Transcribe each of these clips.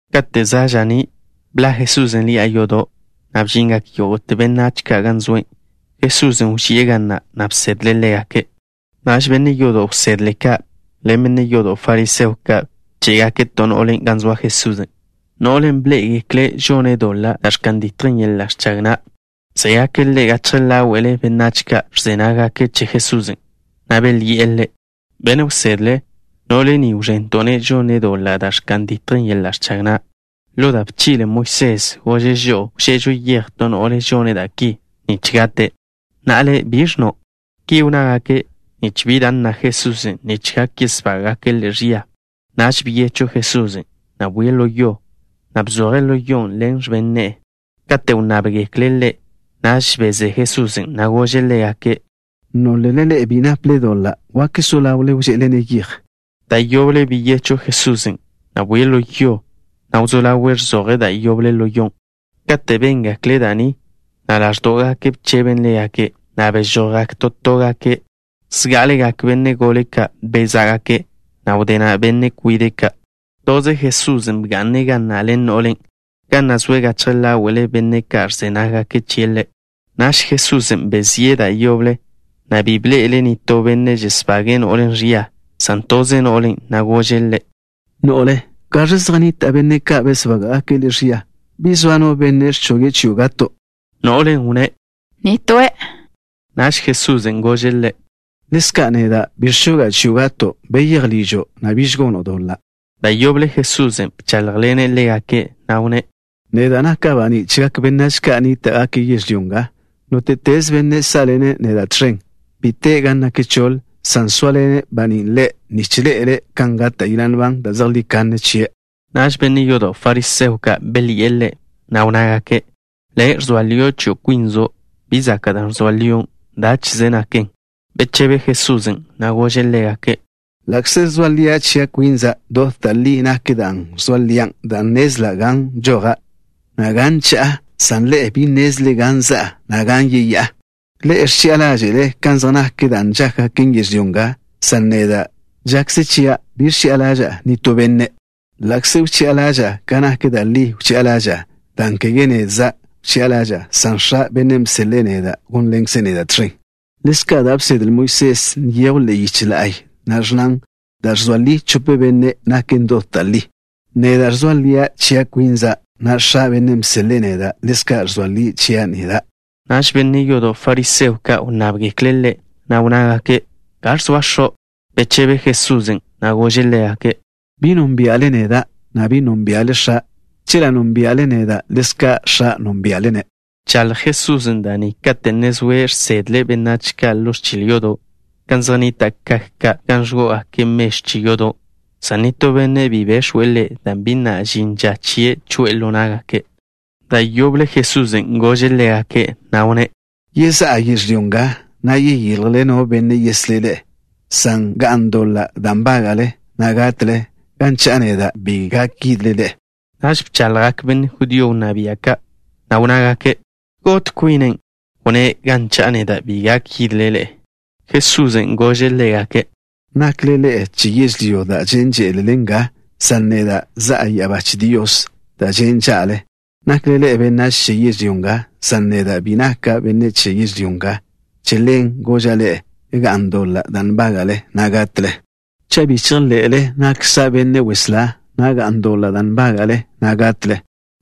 Kate' za' ža'ní', bḻa' Jesusen' ḻi'a yodo', na' bžingak yógo'te benách ka' gan zoe'. Jesusen' wži'e ga na', na' bsedle' ḻégake'. Naž benne' yodo' wsedle ka' ḻen benne' yodo' fariseo ka' bché'gake' to no'le gan zoa Jesusen', no'len' bḻé'egekle' žone' doḻa' da' ẕka'n ditjen yeḻa' ẕchag na'. Bzégake' ḻe' gachje ḻáwe'le benách ka' ẕze nággake' che Jesusen', na' belyi'e Ḻe': —Benne' wsedle, no'le ni wẕento'-ne' žone' doḻa' da' ẕka'n ditjen yeḻa' ẕchag na'. Ḻo da' bchi'le Moisés, gože' žo'o wže'ežo yej to no'le žone' da' ki, nich gate'. ¿Na'a Le', biẕ ẕnno'? Ki wnnágake' nich bi da' nna Jesusen' nich gak yesbága'gake' Ḻe' ẕia. Naž byechw Jesusen', na' bwie' ḻo yo, na' bzoje' ḻo yon' ḻen x̱ben ne'e. Kate' wnnábḻe'egekle' Ḻe', naž bezé Jesusen', na' gože' ḻégake': —Nólele ḻe'e bi naple doḻa' wak so ḻawle wže'ele-ne' yej. Da' yoble beyechw Jesusen', na' bwie' ḻo yo, na' wzó ḻawe' ẕzoje' da' yoble ḻo yon'. Kate' béngekle' da' ni, na' ḻáẕdo'gake' bcheben ḻégake', na' bežojgak to tógake'. Zgá'alegak benne' gole ka' bezá'gake', na' wdé na' benne' kwide' ka'. Toze Jesusen' bga'ne' ḻen no'len', ga na' zoe' gachje ḻáwe'le benne' ka' ẕze nággake' chie' Ḻe'. Naž Jesusen' bezíe' da' yoble, na' bi bḻe'ele' nitó benne' žesbage'e no'len' ẕia, san toze no'len', na' gože' ḻe': —No'le, ¿gaẕ zej nnita' benne' ka' besbága'gake' le' ẕia? ¿Bi zoa no benne' ẕchoge' chio' gato'? No'len' wnné': —Nitóe'. Naž Jesusen' gože' ḻe': —Ḻezka' neda', bi ẕchoga' chio' gato'. Beyéj ližo', na' biž gono' doḻa'. Da' yoble Jesusen' bcháḻjḻene' ḻégake', na' wnné': —Neda' naka' baní' chegak benách ka' nníta'gake' yežlyó nga. Nóte'teze benne' sá'ḻene' neda' tẕen, bi te' gan nak choḻ, san soaḻen baní' ḻe', nich ḻe'ele' kan gata' yeḻa' nban da' zejlí kanne chie'. Naž benne' yodo' fariseo ka' belyi'e Ḻe', na' wnnágake': —Le' ẕzoa lio' chio' kwinzo'. Bi zaka' da' ẕzoa lion'. Dáche'ze naken. Bechebe Jesusen', na' gože' ḻégake': —Ḻa'kze ẕzoa lian' chia' kwinza', dot da' li nak da' ẕzoa lian' dan' nnezla' gan bžoja', na' gan cha'a, san ḻe'e bi nnézlele gan za'a, na' gan yeyá'a. Ḻe'e ẕchi'a ḻáže'le kan zej nak da' ka' žákgaken yežlyó nga, san neda', žakze chia' bi ẕchi'a ḻaža'a nitó benne'. Ḻa'kze wchi'a ḻaža'a, ka nak da' li wchi'a ḻaža'a, dan' kege nedza' wchi'a ḻaža'a, san X̱a', Bennen' bseḻe'e neda', gónḻene' neda' tẕen. Ḻezka' da' bsedle Moisés nyejw ḻe'e yich la'y, na' ẕnnan: “Da' ẕzoa ligak chope benne', naken dot da' li.” Neda' ẕzoa lia' chia' kwinza', na' X̱a', Bennen' bseḻe'e neda', ḻezka' ẕzoa lie' chia' neda'. Naž benne' yodo' fariseo ka' wnnábgekle' Ḻe', na' wnnágake': —¿Gaẕ zoa X̱o'? Bechebe Jesusen', na' gože' ḻégake': —Bi nónbia'le neda', na' bi nónbia'le X̱a'. Chela' nónbia'le neda', ḻezka' X̱a' gónbia'le-ne'. Bchaḻj Jesusen' da' ni kate' ne zoe' žsedle' benách ka' ḻo ẕchil yodo', gan zej nnita' kak ka' gan ẕgó'ogake' mežw che yodo', san nitó benne' bi bex̱we' Ḻe', dan' bi na' žin ža chie' choe'e ḻo ná'gake'. Da' yoble Jesusen' gože' ḻégake', na' wnné': —Yezá'a yežlyó nga, na' yeyiljle no benne' yeslé' ḻe'e, san ga'n doḻa' da' nbága'le, na' gatle. Gan cha'a neda', bi gak yidle ḻe'e. Naž bchaḻjgak benne' judío wnná bia' ka', na' wnnágake': —¿Got kwine'? Wnné': “Gan cha'a neda', bi gak yidle ḻe'e.” Jesusen' gože' ḻégake': —Nakle ḻe'e che yežlyó da' žen' že'le nga, san neda' za'a ya'abá che Dios da' žen' ža'le. Nakle ḻe'e benách che yežlyó nga, san neda' bi naka' benne' che yežlyó nga. Che ḻen goža' ḻe'e: “Ga'n doḻa' da' nbága'le, na' gatle.” Cha' bi chejḻe'le nakkza' Benne' Weslá, ga'n doḻa' da' nbága'le, na' gatle.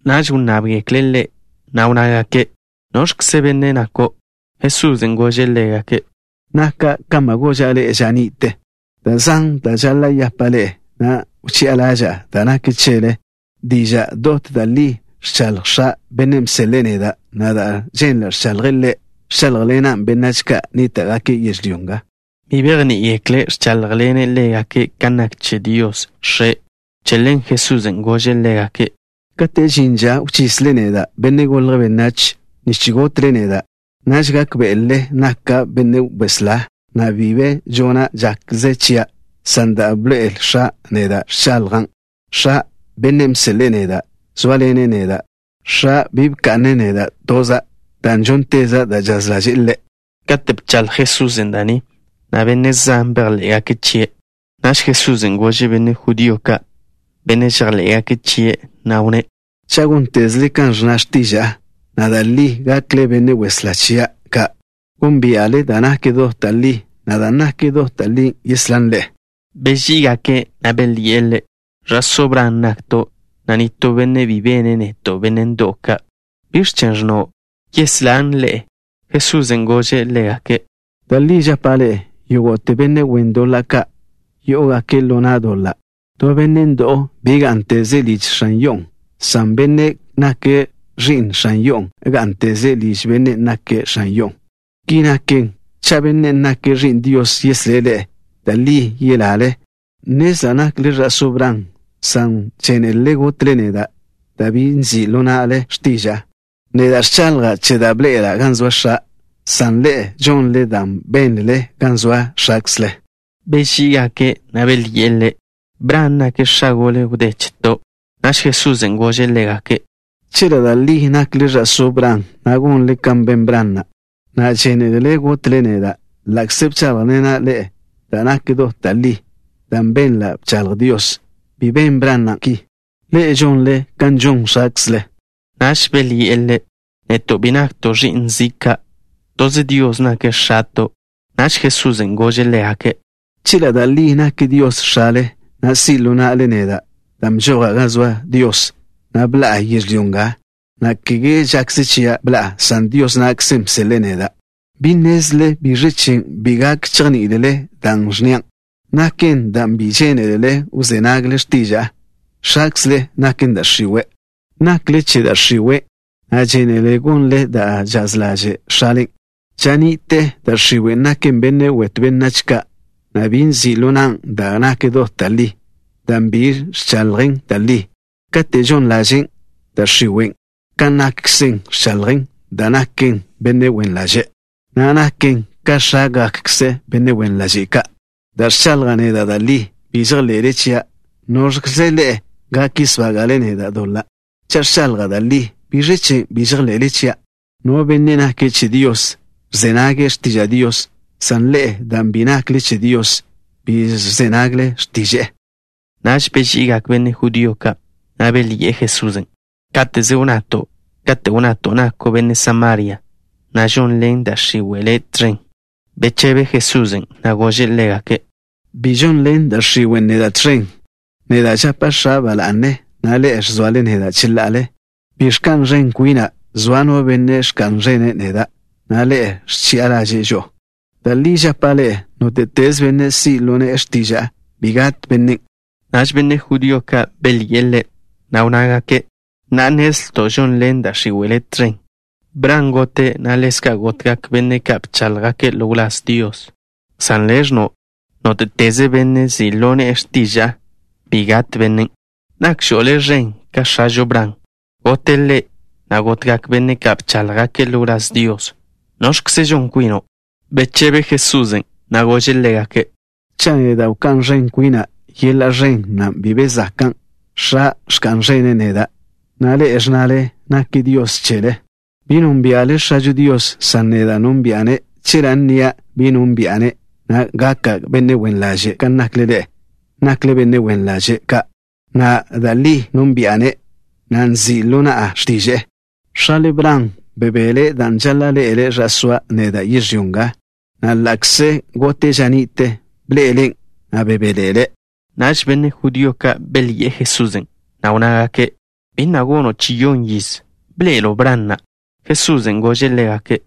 Naž wnnábgekle' Ḻe', na' wnnágake': —¿Noẕkze benne' nako'? Jesusen' gože' ḻégake': —Naka' kan ba goža' ḻe'e ža ni'te. Da' zan da' žaḻa' yapa' ḻe'e, na' wchi'a ḻaža'a da' nak chele. Diža' dot da' li ẕchaḻj X̱a', Bennen' bseḻe'e neda', na' da' ženla' ẕchaḻje' Ḻe', ẕcháḻjḻenan' benách ka' nníta'gake' yežlyó nga. Bi bejní'igekle' ẕcháḻjḻene' ḻégake' kan nak che Dios, X̱e'. Che ḻen Jesusen' gože' ḻégake': —Kate' žin ža wchisle neda', Benne' Golje' Benách, nich gotle neda', naž gákbe'elele nakkza' Benne' Weslá, na' bi be žona' žakze chia', san da' bḻoe'el X̱a' neda' ẕchaḻjan'. X̱a', Bennen' bseḻe'e neda', zóaḻene' neda'. X̱a' bi bka'ne' neda' toza', dan' žónteza' da' žaz ḻaže'e Ḻe'. Kate' bchaḻj Jesusen' da' ni, benne' zan bejḻé'gake' chie'. Naž Jesusen' gože' benne' judío ka', benne' žejḻé'gake' chie', na' wnné': —Cha' góntezele kan ẕnna x̱tiža'a, da' li gakle benne' wsedle chia' ka'. Gónbia'le da' nak dot da' li, na' dan' naken dot da' li yeslán ḻe'e. Beží'igake', na' belyi'e Ḻe': —Ẕa'só Bran nakto', na' bi zoa no benne' bene' neto' benne' ndo'w ka'. ¿Biẕ chen' ẕnno': “Yeslán ḻe'e”? Jesusen' gože' ḻégake': —Da' li žapa' ḻe'e: Yógo'te benne' wen doḻa' ka', yó'ogake' ḻo na' doḻa'. To benne' ndo'w bi gá'nteze' liž x̱an yo'o, san bennen' nake' ẕi'n x̱an yo'on' gá'nteze' liž bennen' nake' x̱an yo'on'. Ki naken, cha' Bennen' nake' Ẕi'n Dios yeslé' ḻe'e, da' li yelale. Nnezla' nakle ẕa'só Bran, san žénelele gotle neda', dan' bi nzi' ḻo na'le x̱tiža'a. Neda' ẕchaḻja' che da' bḻe'ela' gan zoa X̱a', san ḻe'e žonle da' benl-le gan zoa x̱akzle. Beží'igake', na' belyi'e Ḻe': —Bran nake' x̱a gole wdé cheto'. Naž Jesusen' gože' ḻégake': —Chela' da' li nakle ẕa'só Bran, gonle kan ben Bran na'. Na'a, žénelele gotle neda', ḻa'kze ẕcháḻjḻena' ḻe'e da' nak dot da' li, dan' benla' bchaḻj Dios. Bi ben Bran na' ki. Ḻe'e žonle kan žon x̱akzle. Naž belyi'e Ḻe': —Neto' bi nakto' ẕi'n zi' ka'. Toze Dios nake' X̱ato'. Naž Jesusen' gože' ḻégake': —Chela' da' li nak Dios X̱ale, si' ḻo na'le neda', dan' bžoja' gan zoa Dios, na' bḻa'a yežlyó nga. Kege žakze chia' bḻa'a, san Dios na'kze bseḻe'e neda'. ¿Bi nnézlele biẕ chen' bi gak chejní'ilele da' ẕnnia'? Naken dan' bi žénelele wzé nagle x̱tiža'a. X̱akzle naken da' x̱iwe'. Nakle che da' x̱iwen', na' žénelele gonle da' žaz ḻaže' x̱alen'. Ža ni'te da' x̱iwen' naken benne' wetw benách ka', na' bi nzi' ḻo nan' da' nak dot da' li, dan' bi ẕchaḻjen da' li. Kate' žon ḻaže' da' x̱iwe', ka nakkzen ẕchaḻjen, dan' naken benne' wen ḻaže', na' naken ka x̱ágakkze benne' wen ḻaže' ka'. Dan' ẕchaḻja' neda' da' li, bi žejḻe'le chia'. ¿Nóẕlele ḻe'e gak yesbága'le neda' doḻa'? Cha' ẕchaḻja' da' li, ¿biẕ chen' bi žejḻe'le chia'? No benne' nake' che Dios, ẕze nage' x̱tiža' Dios, san ḻe'e, dan' bi nakle che Dios, bi ẕze nagle x̱tiže'e. Naž beži'igak benne' judío ka', na' belyi'e Jesusen': —Káteze wnnato' kate' wnnato' nako' benne' Samaria, na' žonḻen da' x̱iwe' Le' tẕen. Bechebe Jesusen', na' gože' ḻégake': —Bi žonḻen da' x̱iwe' neda' tẕen. Neda' žapa' X̱a' ba la'ne, na' ḻe'e ẕzoale neda' cheḻa'ale. Bi ẕka'n ẕen kwina'. Zoa No Benne' ẕka'n ẕene' neda', na' Ḻe' ẕchi'a ḻaže'e žo'o. Da' li žapa' ḻe'e: nóte'teze benne' si' ḻo ne'e x̱tiža'a, bi gat bennen'. Naž benne' judío ka' belyi'e Ḻe', na' wnnágake': —Na'a nnezlto' žonḻen da' x̱iwe' Le' tẕen. Bran gote', na' ḻezka' gotgak benne' ka' bcháḻjgake' ḻo wláz Dios, san Le' ẕnno': “Nóte'teze benne' si' ḻo ne'e x̱tiža'a, bi gat bennen'.” ¿Nakžo' Le' ẕen ka x̱ažo Bran? Gote' ḻe', na' gotgak benne' ka' bcháḻjgake' ḻo wláz Dios. ¿Noẕkzen' žon kwino'? Bechebe Jesusen', na' gože' ḻégake': —Cha' neda' wká'n ẕen kwina', yeḻa' ẕen na' bi be zakan'. X̱a' ẕka'n ẕene' neda', na' ḻe'e ẕnnale nake' Dios chele. Bi nónbia'le X̱ažo Dios, san neda' nónbi'a-ne'. Chela' nnia': bi nónbi'a-ne', na' gaka' benne' wen ḻaže' kan nakle ḻe'e. Nakle benne' wen ḻaže' ka'. Na'a, da' li nónbi'a-ne', na' nzi' ḻo na'a x̱tiže'e. X̱ale Bran bebele' dan' žaḻa' ḻe'ele' ža soa' neda' yežlyó nga, na' ḻa'kze gote' ža ni'te, bḻe'eḻen', na' bebéḻe'ele'. Naž benne' judío ka' belyi'e Jesusen', na' wnnágake': —Bi na' gono' chi-yon yiz. ¿Bḻe'elo' Bran na'? Jesusen' gože' ḻégake':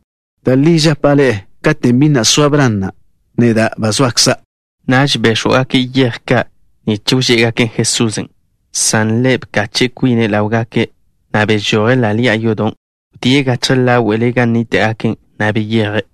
—Da' li žapa' ḻe'e: katen' bi na' soa Bran na', neda' ba zoakza'. Naž béx̱wgake' yej ka' nich wžé'egaken' Jesusen', san Ḻe' bkache' kwine' ḻáwgake', na' bežoje' ḻa' ḻi'a yodon'. Wdíe' gachje ḻáwe'le gan nníta'gake', na' beyeje'.